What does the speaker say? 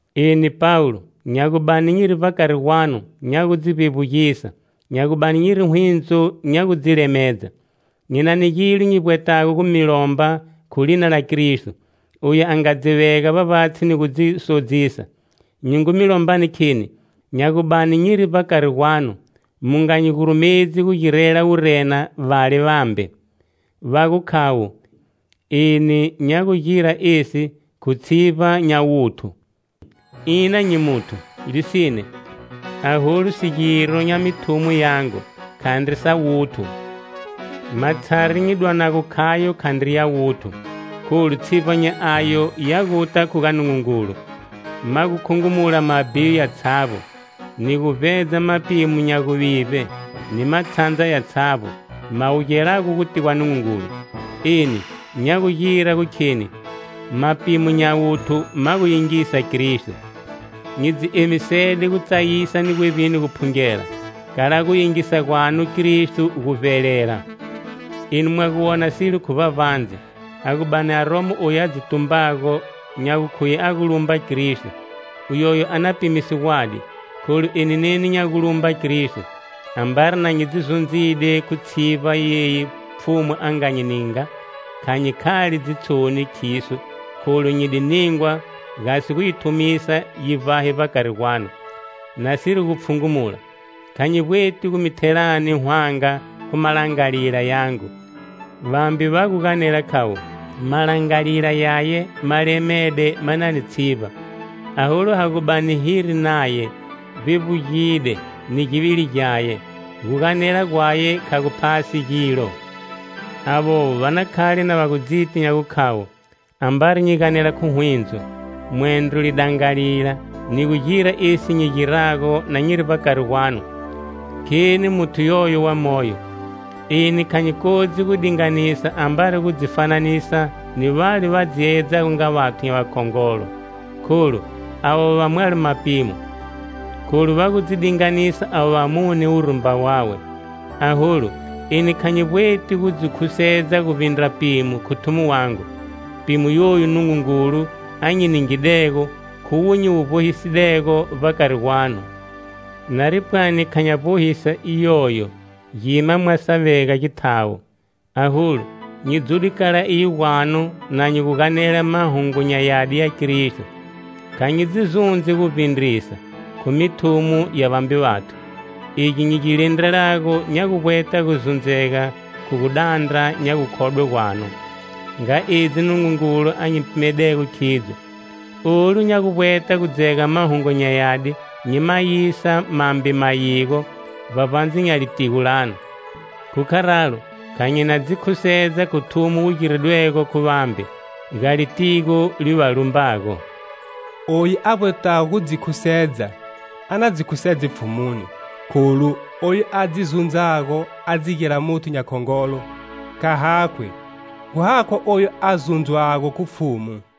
Eni, Pawulo, nya gu bani nyiri vbakari gwanu nya gu dzi vbevbugisa, nya gu bani nyiri hwindzo nya gu dzi lemedza. Nyi na ni gilo nyi vbwetago gumi lomba khu lina la Kristo, oyu a nga dzi vega vbavbatshi ni gu dzi sodzisa. Nyi ngu mi lombani kheni, nya gu bani nyiri vbakari gwanu mu nga nyi gurumedzi gu girela wurena vale vambe, va gu khavo, eni nya gugira esi khu tshivba nya wuthu. Ina nyi muthu, lisine. Aholu sigiro nya mithumo yangu, khandri sa wuthu. Matshari nyi dwanago khayo khandri ya wuthu, kholu tshivba nya ayo ya guta khu ga Nungungulu, ma gu khungumula mabhiyo yatshavbo, ni gu vbedza mapimo nya guvivbe, ni matshandza yatshavbo, ma wugelago guti gwa Nungungulu. Eni, nya gugira gu kheni, mapimo nya wuthu ma gu yingisa Kristo. Nyi dzi emisede gutsayisa ni gwevbini guphungela, kala gu yingisa gwanu Kristo gu vbelela. Enu mwa gu wona silo khu vbavbandze. A gu bani aromo oyu a dzi tumbago, nya gukhuye a gu lumba Kristo, uyoyo a na pimise gwadi, kholu eni neni nya gu lumba Kristo. Ambari na nyi dzi zundzide khu tshivba yeyi Pfhumu a nga nyi ninga, kha nyi khali dzitshoni khiso, kholu nyi di ningwa gasi gu yi thumisa yi vbahe vbakari gwanu, nasiri gu pfhungumula. Kha nyi vbweti gu mi thelani hwanga khu malangalila yangu. Vambe va guganela khavo: "Malangalila yaye ma lemede ma na ni tshivba, aholu ha gu bani hiri naye, vbevbugide ni givili gyaye, gu ganela gwaye kha gu phasi gilo". Avovo va na khale na va gu dziti nya gukhavo, ambari nyi ganela khu hwindzo, mwendro khu lidangalila, ni gu gira esi nyi girago na nyiri vbakari gwanu, kheni muthu yoyo wa moyo. Eni kha nyi kodzi gu dinganisa ambari gu dzi fananisa ni vale va dzi yeyedzago nga vathu nya vakhongolo, kholu, avovo va mwalo mapimo, kholu va gu dzi dinganisa avo vamune khu wurumba wawe. Aholu, eni kha nyi vbweti gu dzi khusedza guvbindra pimo khu thumo wangu, pimo yoyu Nungungulu, a nyi ningidego, khuwo nyi wu vbohisidego vbakari gwanu. Nari pwani kha nya vbohisa iyoyo, gima mwa sa vega githawo. Aholu, nyi dzude kala iyo gwanu na nyi guganela Mahungu nya Yadi ya Kristo. Kha nyi dzi zundzi gu vbindrisa, khu mithumo ya vambe vathu. Egi nyi gi lindrelago nya guvbweta gu zundzega khu gu dandra nya gukhodwe gwanu, nga edzi Nungungulu a nyi pimedego khidzo. Olu nya gu vbweta gu dzega Mahungu nya Yadi nyi ma yisa mambe mayigo, vbavbandze nya litigo lanu. Khu kharalo kha nyi na dzi khusedza khu thumo wu giridwego khu vambe, ga litigo li va lumbago. Oyu a vbwetago gu dzi khusedza, a na dzi khusedze Pfhumuni. Kholu, oyu a dzi zundzago a dzi gira muthu nya khongolo, kha hakhwi, gu hakhwa oyu a zundzwago khu Pfhumu.